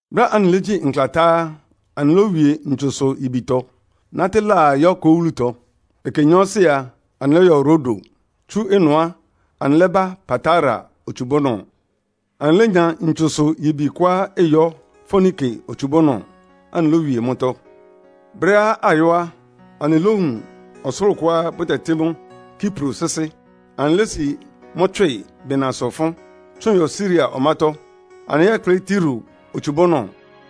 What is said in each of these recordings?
Brɛ́á anɩlégyí nkla tá á, anɩlówie ntsusʋ-yibitɔ, nátɩ́ laa yɔ́ Ko wúlutɔ. Ɛkɛ nyɔɔsɩ a, anɩlɔ́yɔ Rodo. Tsú ɩnʋ á, anɩlɛ́bá Patara otsubúnɔ. Anɩlénya ntsusʋ-yibi kʋá ɩyɔ́ Foinike otsubúnɔ, anɩlówie mʋ́tɔ́. Brɛ́á ayɔ́ á, anɩlówun ɔsʋlʋ́ʋ kʋá bʋtɛtɩ́ mʋ́ Kipro sɩ́sɩ́. Anɩlési mʋ́ tswɩ bɩnasʋ ɩfʋ́n, tsʋn yɔ Siria ɔmátɔ́. Anɩlɛ́yɛkplɩ́ Tiro otsubúnɔ,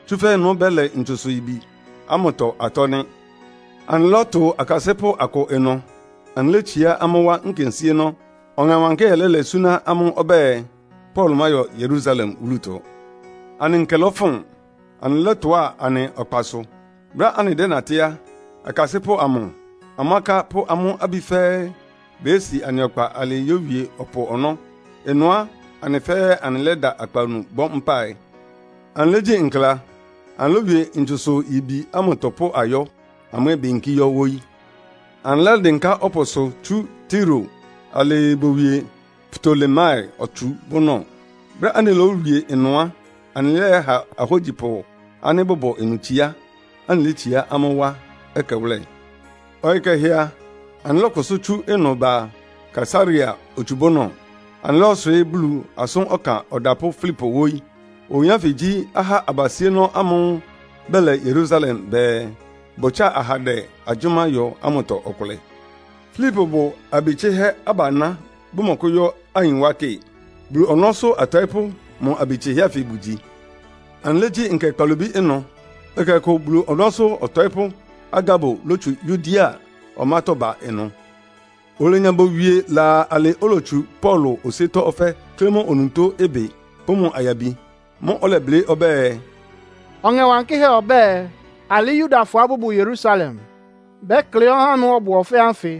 tsúfɛ́ ɩnʋ́ bɛ́lɛ ntsusʋ-yibi ámʋtɔ atɔ́ nɩ́. Anɩlɔ́tʋ akasɩ́pʋ́ akʋ ɩnʋ, anɩlétsiá amʋ́ wá nkensíénɔ́. Ɔŋɛ Wankɩ́hɛ́ lɛ́lɛ súná amʋ́ ɔbɛ́ɛ, Paulo máyɔ Yerusalem wúlutɔ. Anɩ nkɛ lɔfʋn, anɩlɔ́tʋá anɩ ɔkpasʋ. Brɛ́á anɩdɛ́natɩ́ á, akasɩ́pʋ́ amʋ, amʋ́ aká pʋ́ amʋ́ abí fɛ́ɛ́ beyési anɩ ɔkpa alɩɩ yówie ɔpʋ ɔnɔ́. Ɩnʋ á, anɩ fɛ́ɛ́ anɩlɛ́da akpawunu bɔ́ mpáɩ. Anɩlégyí nkla, anɩlówie ntsusʋ-yibi ámʋtɔ pʋ́ ayɔ́, amʋ́ ɛ́ beyinkí yɔ́ wóyí. Anɩlɛ́dɩnká ɔpʋsʋ tsú Tiro alɩɩ bowie Ptolemai otsubúnɔ. Brɛ́á anɩlówie ɩnʋ á, anɩlɛ́yɛha ahógyipʋ ánɩ́ bʋbʋ ɩnʋ itsiá, anɩlétsiá amʋ́ wá ɛkɛwʋ́lɛ. Ɔyɩ kɛhɛ a, anɩlɔ́kʋsʋ́ tsú ɩnʋ ba Kaesarea otsubúnɔ. Anɩlɔ́yɔswɩɩ́ Bulu asʋ́n ɔkan ɔdapʋ́ Filipo wóyí. Oyin ánfɩ gyí ahá abasíénɔ́ ámʋ́ʋ́ bɛlɛ Yerusalem bɛɛ, bʋtsáa ahandɛ agyʋ́má yɔ ámʋtɔ ɔkʋlɛ. Filipo bʋ abi tsɩhɛ́ abaná, bʋmɔkʋ́yɔ́ ayin wá kɩ. Bulu ɔnɔ́sʋ́ atɔɩ́pʋ́ mʋ abi tsɩhɛ́ ánfɩ bʋgyi. Anɩlégyí nkɛ kpalobí ɩnʋ. Ɛkɛ ɔkʋ Bulu ɔnɔ́sʋ́ ɔtɔɩ́pʋ́ Agabo lótsu Yudea ɔmátɔ́ ba ɩnʋ. Olenya bowie laa alɩ́ olotsu Paulo osíétɔ́ ɔfɛ́ klɩ́ mʋ onutó ɩbɩ pʋ́ mʋ ayabi. Mʋ́ʋ́ ɔlɛblɩ́ ɔbɛ́ɛ, “Ɔŋɛ Wankɩ́hɛ́ ɔbɛ́ɛ, ‘Alɩ́ Yudafɔá bʋbʋ Yerusalem bɛ́klɩ́ ɔhá ámʋ́ʋ́ ɔbʋ ɔfɛ́ ánfɩ,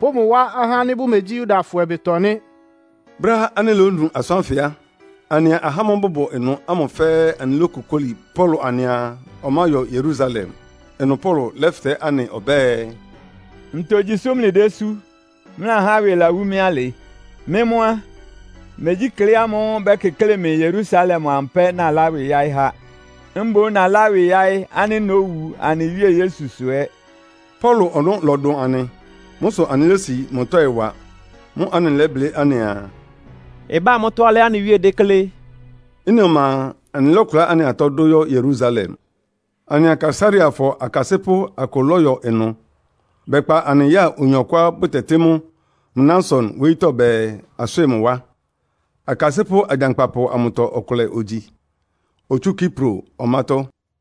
pʋ́ mʋ wá ahá ánɩ́ bʋmegyí Yudafɔ ɩbɩtɔ nɩ́.’” Brɛ́á anɩlónu asʋ́n ánfɩ á, anɩa ahá ámʋ́ʋ́ bʋbʋ ɩnʋ ámʋ fɛ́ɛ́ anɩlókokóli Paulo anɩaa ɔmáyɔ Yerusalem. Ɩnʋ Paulo lɛ́fɩtɛ́ anɩ ɔbɛ́ɛ, “Ntogyi sʋ́ mlɩdésú, mlɩlahá ɩwɩ lawú mɩ́ alɩ? Mɩ́ mʋ́ á, megyí klɩ́ ámʋ́ʋ́ bɛ́kɩklɩ́ɩ mɩ Yerusalem amʋ pɛ́ nalá ɩwɩ yáɩ́ há. Mboún nalá ɩwɩ yáɩ́ ánɩ́ nówu anɩ Wíe Yesu sʋ ɛ́.” Paulo ɔnɔ́ lɔdʋn anɩ. Mʋ́ sʋ anɩlési mʋ tɔ́ɩ wa. Mʋ́ʋ́ anɩlɛ́blɩ́ anɩaa, “Ɩbá mʋ́tɔ́ alɩá anɩ Wíe déklé.” Ɩ́nɩ ɔma a, anɩlɔ́kʋlá anɩ atɔ́ dʋ yɔ́ Yerusalem. Anɩa Kaesareafɔ akasɩ́pʋ́ akʋ lɔ́yɔ ɩnʋ. Bɛkpa anɩ ya oyin ɔkʋá bʋtɛtɩ́ mʋ Mnason wóyítɔ́ bɛɛ, aswɩ́ɩ mʋ wá. Akasɩ́pʋ́ agyankpapʋ amʋtɔ ɔkʋlɛ ogyi, otsú Kipro ɔmátɔ́.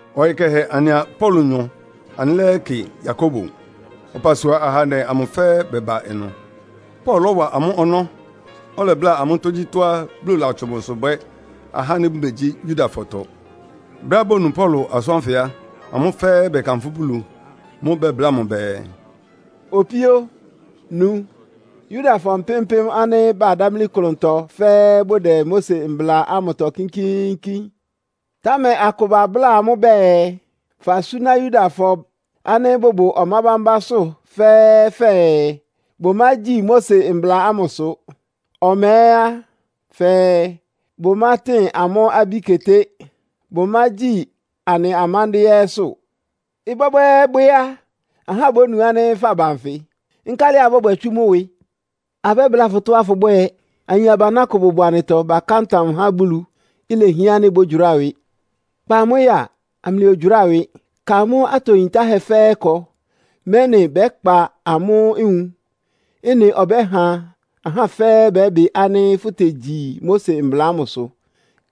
Ɔyɩ kɛhɛ anɩa Paulonyɔ anɩlɛ́yɛkɩ Yakobo. Ɔpasua ahandɛ amʋ fɛ́ɛ́ bɛba ɩnʋ. Paulo lɔ́wa amʋ́ ɔnɔ́, ɔlɛbláa amʋ́ tógyítɔ́á Bulu latsʋn mʋsʋ bwɛ́ ahá ánɩ́ bʋmegyí Yudafɔtɔ. Brɛ́á bonu Paulo asʋ́n ánfɩ á, amʋ́ fɛ́ɛ́ bɛkanfʋ́ Bulu. Mʋ́ʋ́ bɛbláa mʋ bɛɛ, “Opíó nu, Yudafɔ mpɩ́m-mpɩ́m ánɩ́ badámlí klʋntɔ fɛ́ɛ́ bʋdɛ Mose mbla ámʋtɔ kínkíínkín. Támɛ akʋ babláa amʋ́ bɛɛ, fasúná Yudafɔ ánɩ́ bʋbʋ ɔmá bámbásʋ́ fɛ́ɛ́ fɛɛ, bʋmágyi Mose mbla ámʋsʋ. Ɔma ɛ́ á, fɛɛ bʋmátɩn amʋ́ abí keté, bʋmágyi anɩ amándɩ́ɛ́ ɛ́sʋ́. Ɩbwɛ́bwɛ́ɛ́bwɛ́ á, ahá bónu ánɩ́ faba nfɩ. Nkálɩ abɔ́bwɛ tsú mʋ́ ɩwɩ? Abɛ́bláa fʋ tɔ́á fʋbwɛ́ɛ. Ayin abaná akʋá bʋbʋ anɩtɔ baká ntam há Bulu. Ilehián ánɩ́ bɔ́gyʋráa ɩwɩ. Kpa amʋ́ ya, amlɩyɔgyʋráa ɩwɩ. Ka amʋ́ atɔ yintáhɛ́ fɛ́ɛ́ ɩkɔ, mɛ́nɩ bɛ́kpa amʋ́ nwun. Ɩ́nɩ ɔbɛ́ha ahá fɛ́ɛ́ bɛ́bɩ ánɩ́ fʋtegyi Mose mbla ámʋsʋ.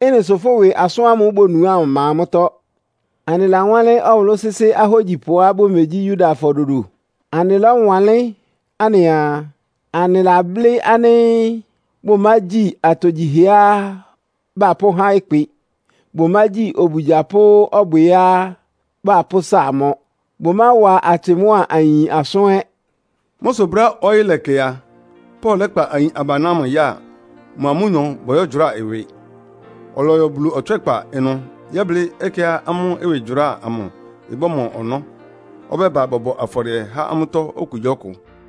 Ɩ́nɩ sʋ fʋ́ ɩwɩ asʋ́n ámʋ́ʋ́ bonu ámʋ ɩma mʋ́tɔ́. Anɩlawánlɩ́n ɔwʋlʋ́ sɩ́sɩ́ ahógyipʋá bʋmegyí Yudafɔ dodo. Anɩlɔ́wanlɩ́n anɩaa, anɩlablɩ́ ánɩ́ bʋmágyi atogyihɛá bapʋ́há ɩkpɩ. Bʋmágyi obugya pʋ́ ɔbwɩá bapʋ́sa mɔ. Bʋmáwa atsɩ mʋ́a ayin asʋ́n ɛ́.” Mʋ́ sʋ brɛ́á ɔyɩ́ lɛkɛ a, Paulo lɛ́kpa ayin abaná ámʋ ya, mʋa amʋ́nyɔ bɔyɔ́gyʋráa ɩwɩ. Ɔlɔyɔ Bulu ɔtswɛ́kpa ɩnʋ yɛ́blɩ́ ɛkɛá amʋ́ ɩwɩgyʋráa amʋ ɩbɔ́mɔ ɔnɔ́, ɔbɛ́ba bɔbɔ afɔdɩɛ há amʋ́tɔ́ okugyíɔkʋ.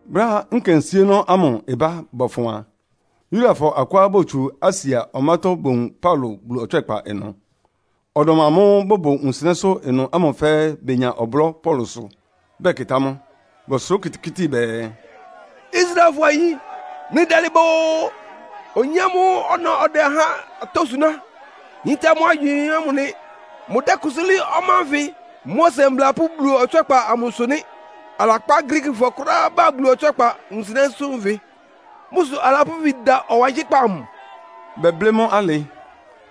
Brɛ́á nkensíénɔ́ ámʋ ɩbá bɔfʋn a, Yudafɔ akʋá botsú Asia ɔmátɔ́ bowun Paulo Bulu ɔtswɛ́kpa ɩnʋ. Ɔdɔm amʋ́ʋ́ bʋbʋ wunsɩnɛ́sʋ́ ɩnʋ ámʋ fɛ́ɛ́ benya ɔblɔ́ Paulosʋ, bɛkɩtá mʋ. Bɔsʋrá okitikíti bɛɛ, “Israelfɔ ayin, mlɩdalɩ ba oo! Oyin ámʋ́ʋ́ ɔna ɔdɛ ahá atɔ́ suná, yíntá amʋ́ agywɩɩn ámʋ nɩ. Mʋdɛ́kʋsʋ́ lɩ́ɩ́ ɔmá ánfɩ, Mose Mbla pʋ́ Bulu ɔtswɛ́kpa amʋsʋ nɩ́. Alakpá Griikifɔ kʋ́ráá ba Bulu ɔtswɛ́kpa wunsɩnɛ́sʋ́ nfɩ. Mʋ́ sʋ alapʋ́ ifin da ɔwankɩ́kpá amʋ.” Bɛblɩ́ mʋ́ alɩ,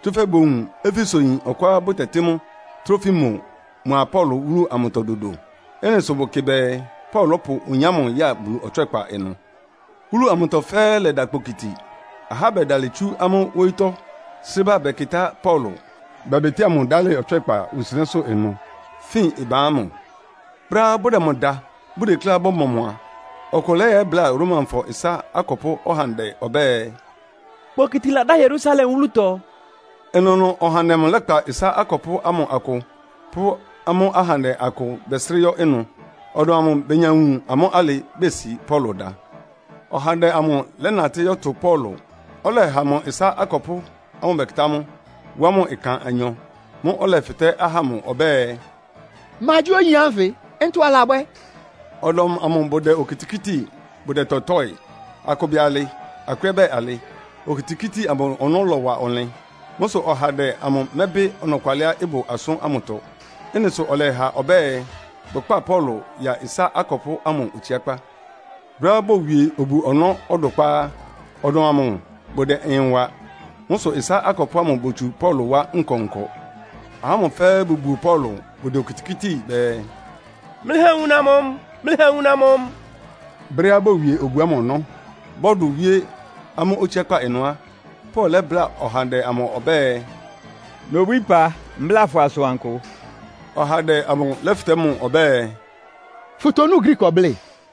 tsúfɛ́ bowun Efesoyin ɔkʋá bʋtɛtɩ́ mʋ Trofimo mʋa Paulo wúlu amʋtɔ dodo. Ɩ́nɩ sʋ bʋkɩ bɛɛ Paulo lɔ́pʋ oyin ámʋ yáa Bulu ɔtswɛ́kpa ɩnʋ. Wúlu amʋtɔ fɛ́ɛ́ lɛda kpokiti. Ahá bɛdalɩ tsu amʋ́ wóyítɔ́ srɩ́ ba bɛkɩtá Paulo, bɛbɩtɩ́a mʋ dálɩ ɔtswɛ́kpa wunsɩnɛ́sʋ́ ɩnʋ, fin ɩban ámʋ. Brɛ́á bʋdɛ mʋ da, bʋdekléá bɔ́mɔ mʋ a, ɔkʋ lɛ́yɛbláa Romafɔ ɩsá akɔpʋ́ ɔhandɛ ɔbɛ́ɛ, “Kpokiti ladá Yerusalem wúlutɔ.” Ɩnʋnʋ ɔhandɛ amʋ lɛ́kpa ɩsá akɔpʋ́ ámʋ akʋ pʋ́ amʋ́ ahandɛ akʋ bɛsrɩ́ yɔ́ ɩnʋ. Ɔdɔm amʋ benya wun amʋ́ alɩ besi Paulo dá. Ɔhandɛ amʋ lɛ́natɩ́ yɔ́tʋ Paulo, ɔlɛha mʋ ɩsá akɔpʋ́ ámʋ bɛkɩtá mʋ, wá mʋ ɩkan anyɔ. Mʋ́ʋ́ ɔlɛfɩtɛ́ ahá ámʋ ɔbɛ́ɛ, “Ma gyí oyin ánfɩ? Ntɔ alabwɛ́?” Ɔdɔm amʋ bʋdɛ okitikíti, bʋdɛtɔtɔ́ɩ. Akʋ bɛɛ alɩ, akʋ ɛ́ bɛɛ alɩ. Okitikíti amʋ ɔnɔ́ lɔwa ɔnlɩn. Mʋ́ sʋ ɔhandɛ amʋ mɛ́bɩ ɔnɔkwalɩá ɩbʋ asʋ́n ámʋtɔ. Ɩ́nɩ sʋ ɔlɛha ɔbɛ́ɛ, bʋkpá Paulo ya ɩsá akɔpʋ́ ámʋ otsiákpá. Brɛ́á bowie obu-ɔnɔ́ ɔdʋkpá á, ɔdɔm amʋ bʋdɛ ɩyɩn wa. Mʋ́ sʋ ɩsá akɔpʋ́ ámʋ botsu Paulo wá nkɔnkɔ. Ahá ámʋ fɛ́ɛ́ bʋbuo Paulo, bʋdɛ okitikíti bɛɛ, “Mlɩha awuna mɔ mʋ! Mlɩha awuna mɔ mʋ!” Brɛ́á bowie obu ámʋ ɔnɔ́, bɔ́dʋ wíé amʋ́ otsiákpá ɩnʋ á, Paulo lɛ́bláa ɔhandɛ amʋ ɔbɛ́ɛ, “Nobwíí ɩpa, mbláa fʋ asʋankʋ.” Ɔhandɛ amʋ lɛ́fɩtɛ́ mʋ ɔbɛ́ɛ, “Fʋtonú Griiki ɔblɩ́ɩ?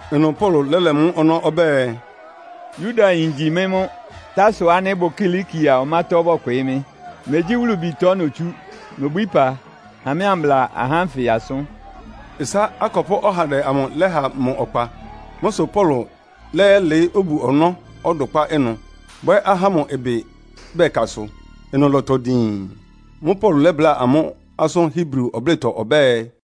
Ɩnʋ Paulo lɛ́lɛ mʋ́ ɔnɔ́ ɔbɛ́ɛ, “Yudayin ngyi mɩ́ mʋ́. Tarso ánɩ́ ɩbʋ Kilikia ɔmátɔ́ bɔkwɩɩ́ mɩ́. Megyí wúlubitɔ notsú. Nobwíí ɩpa, ha mɩ́ ambla ahá ánfɩ asʋ́n.” Ɩsá akɔpʋ́ ɔhandɛ amʋ lɛ́ha mʋ ɔkpa. Mʋ́ sʋ Paulo lɛ́yɛlɩɩ́ obu-ɔnɔ́ ɔdʋkpá ɩnʋ, bwɛ́ ahá ámʋ ɩbɩ bɛ́kasʋ. Ɩnʋ lɔ́tɔ diin. Mʋ́ʋ́ Paulo lɛ́bláa amʋ́ asʋ́n Hebri ɔblɩ́tɔ ɔbɛ́ɛ,